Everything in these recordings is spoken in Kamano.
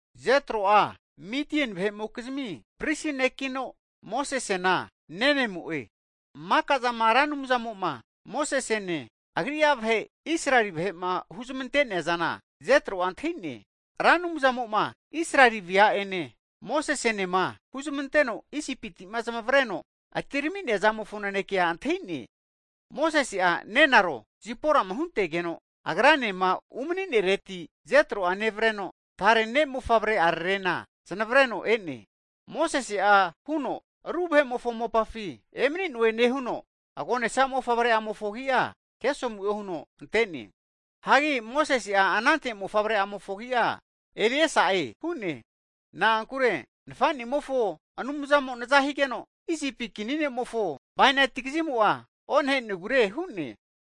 Jetro'a Mitieni vahe'mokizmi pristi nekino, Mosesena nenemo'e. Maka'zama Ra Anumzamo'ma Mosesene Agri'a vahe Israeli vahe'ma huzmante'neazana Jetro'a antahi'ne. Ra Anumzamo'ma Israeli vea'ene Mosesenema huzmanteno Isipiti'ma zamavreno atirami'nea zamofo nanekea antahi'ne. Mosese'a nenaro Ziporama huntegeno agranema umani'nenereti Jetro'a nevreno, tare ne' mofavre'ararena znavreno e'ne. Mosese'a huno, Ru vahe'mofo mopafi emani'noe nehuno, agonesa mofavre'amofo agi'a Gesomu'e huno ante'ne. Hagi Mosese'a anante mofavre'amofo agi'a Eliesa'e hu'ne. Na'ankure nafa'nimofo Anumzamo naza higeno, Isipi kini ne'mofo bainati kazimo'a onahe'negure hu'ne.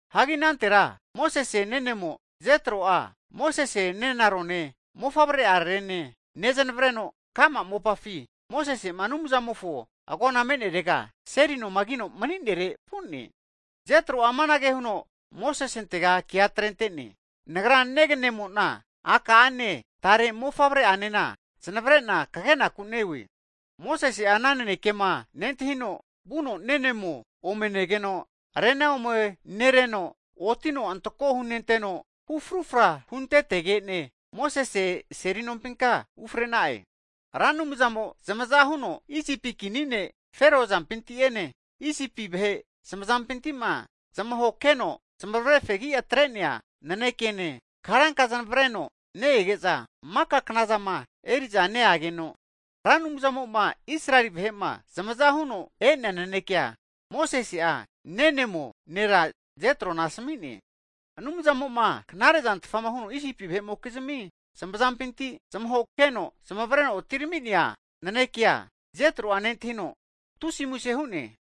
Hagi anantera Mosese nenemo Jetro'a, Mosese nenarone mofavre'ararene nezamavreno, ka'ma mopafi Mosese'ma Anumzamofo agona me'nerega seli noma kino mani'nere vu'ne. Jetro'a amanage huno Mosesentega kea atrente'ne, Nagra neganemo'na aka'ane tare mofavreka'ane zamavare'na kagenaku neone. Hagi Mosese'a ana nanekema nentahino vuno nenemo ome negeno, rena omenereno, otino antako hunenteno, hu frufra huntetege'ne, Mosese seli nompinka ufre'na'e. Hagi Ra Anumzamo'a zamaza huno Isipi kini ne' Fero azampinti'ene Isipi vahe zamazampinti'ma zamahokeno zmavre fegi atre'nea nanekene, karanka zamavreno ne-ege'za maka knazama eri'za neageno, Ra Anumzamo'ma Israeli vahe'ma zamazama huno e'nea naneke'a Mosese'a nenemo nera Jetrona asmi'ne. Anumzamo'ma knare'zantfa huno Isipi vahe'mokizmi zamazampinti zamahokeno zamavreno atirami'nea nanekea Jetro'a nentahino, tusi'a muse hu'ne.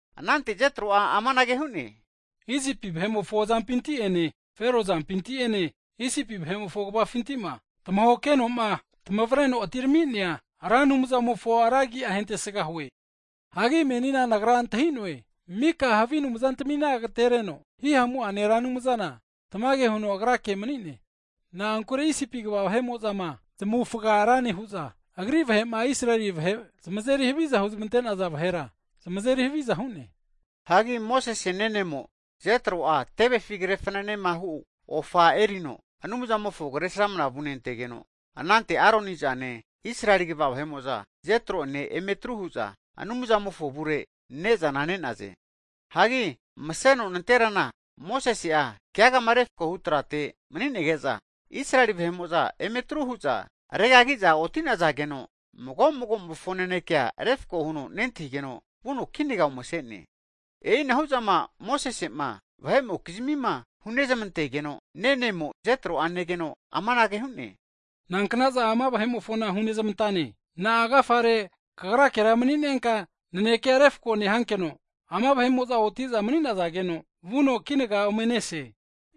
Anante Jetro'a amanage hu'ne, Isipi vahe'mofo azampinti'ene Fero azampinti'ene Isipi vahe'mofo kvafinti'ma tamahokeno'ma tamavreno atirami'nea Ra Anumzamofona ra agi'a hentesga hue. Hagi menina nagra antahi'noe, mika havi anumzantamina agtereno, hihamu'ane Ra Anumzana tamage huno Agrake mani'ne. Na'ankure Isipi kva vahe'mo'zama zmavufga ra nehu'za, Agri vahe'ma Israeli vahe zamazeri haviza huzmante'naza vahera, zamazeri haviza hu'ne. Hagi Mosese nenemo Jetro'a tevefima kre fananema hu ofa erino, Anumzamofo Kresramana vunentegeno, anante Aroni zane, Israeli kva vahe'mo'za Jetro'ene emetru hu'za Anumzamofo avurera ne'zana ne'naze. Hagi maseno nanterana Mosese'a keagama refkohu trate mani'nege'za, Israeli vahe'mo'za emetru hu'za regagi'za oti'nazageno, mago'magomofo nanekea refko huno nentahigeno, vuno kinaga ome ase'ne. E'inahu'zama Mosese'ma vahe'mokizmima hunezmantegeno, nenemo Jetro'a negeno amanage hu'ne, nankna'za ama vahe'mofona hunezmantane? Na'a agafare kagrakera mani'nenka nanekea refko nehankeno, ama vahe'mo'za oti'za mani'nazageno vuno kinaga omenese?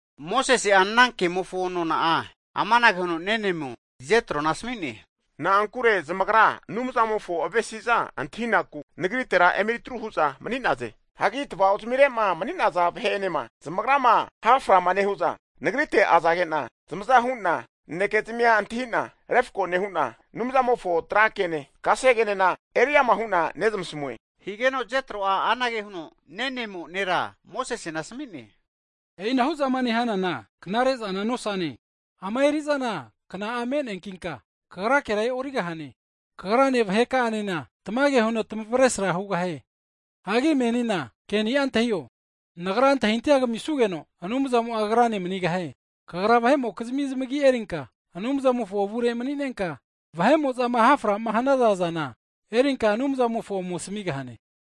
Mosese'a ana kemofo nona'a amanage huno nenemo Jetrona asami'ne, Na'ankure zamagra Anumzamofo avesi'za antahinaku nagritera emetru hu'za mani'naze. Hagi tava'ozmire'ma mani'naza vahe'enema zmagrama ha'frama nehu'za, nagrite azage'na zamaza hu'na naneke'zimia antahi'na refko nehu'na, Anumzamofo tra kene, kasegenena eri ama hu'na nezmasamue. Higeno Jetro'a anage huno nenemo nera Mosesena asami'ne. E'inahu zama nehanana knare zana nosane. Ama eri'zana kna'a me'neankinka, kagrakera e'origahane. Kagrane vahe'ka'anena tamage huno tamavesra hugahie. Hagi menina ke'ni'a antahio, nagra antahintahia kamisugeno Anumzamo'a kagrane manigahie. Kagra vahe'mokizmi zmagi erinka Anumzamofo avure mani'nenka, vahe'mo'zama ha'frama hanaza zana erinka Anumzamofo ome asamigahane.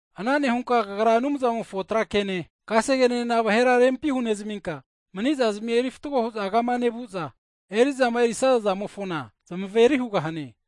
Ana nehunka kagra Anumzamofo tra kene kasegenena vahera rempi hunezminka, mani'zazimi eri fatgo hu'za kama nevu'za, eri'zama erisaza zamofona zmaveri hughane.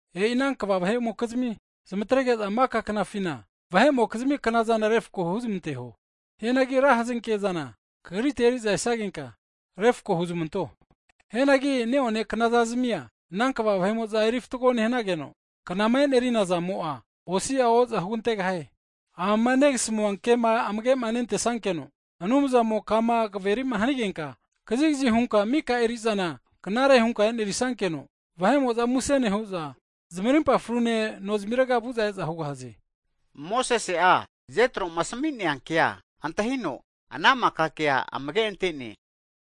E'i ana kva vahe'mokizmi zamatrege'za maka knafina, vahe'mokizmi knazana refko huzmanteho. Hianagi ra hazenke'zana kagrite eri'za esagenka refko huzmanto. Hianagi ne'one knazazamia ana kva vahe'mo'za eri fatgo nehanageno, knama e'nerina zamo'a osi'a o'za hugantegahie. Amama negasmua kema amage nentesankeno, Anumzamo kama kaverima hanigenka kazikazi hunka mika eri'zana knare hunka e'nerisankeno, vahe'mo'za muse nehu'za zamarimpa fru'ne nozimirega vu'za e'za hugahaze. Mosese'a, Jetro'ma asmi'nea kea antahino, ana maka kea amage ante'ne.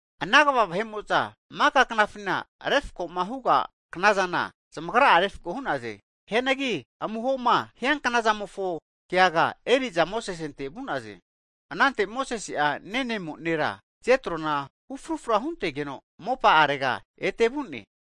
Ana kva vahe'mo'za maka knafina, refko'ma huga knazana zamagra'a refko hu'naze. Hianagi amuhoma hianknazamofo keaga eri'za Mosesente vu'naze. Anante Mosese'a nenemo nera Jetrona hu frufra huntegeno mopa'arega ete vu'ne.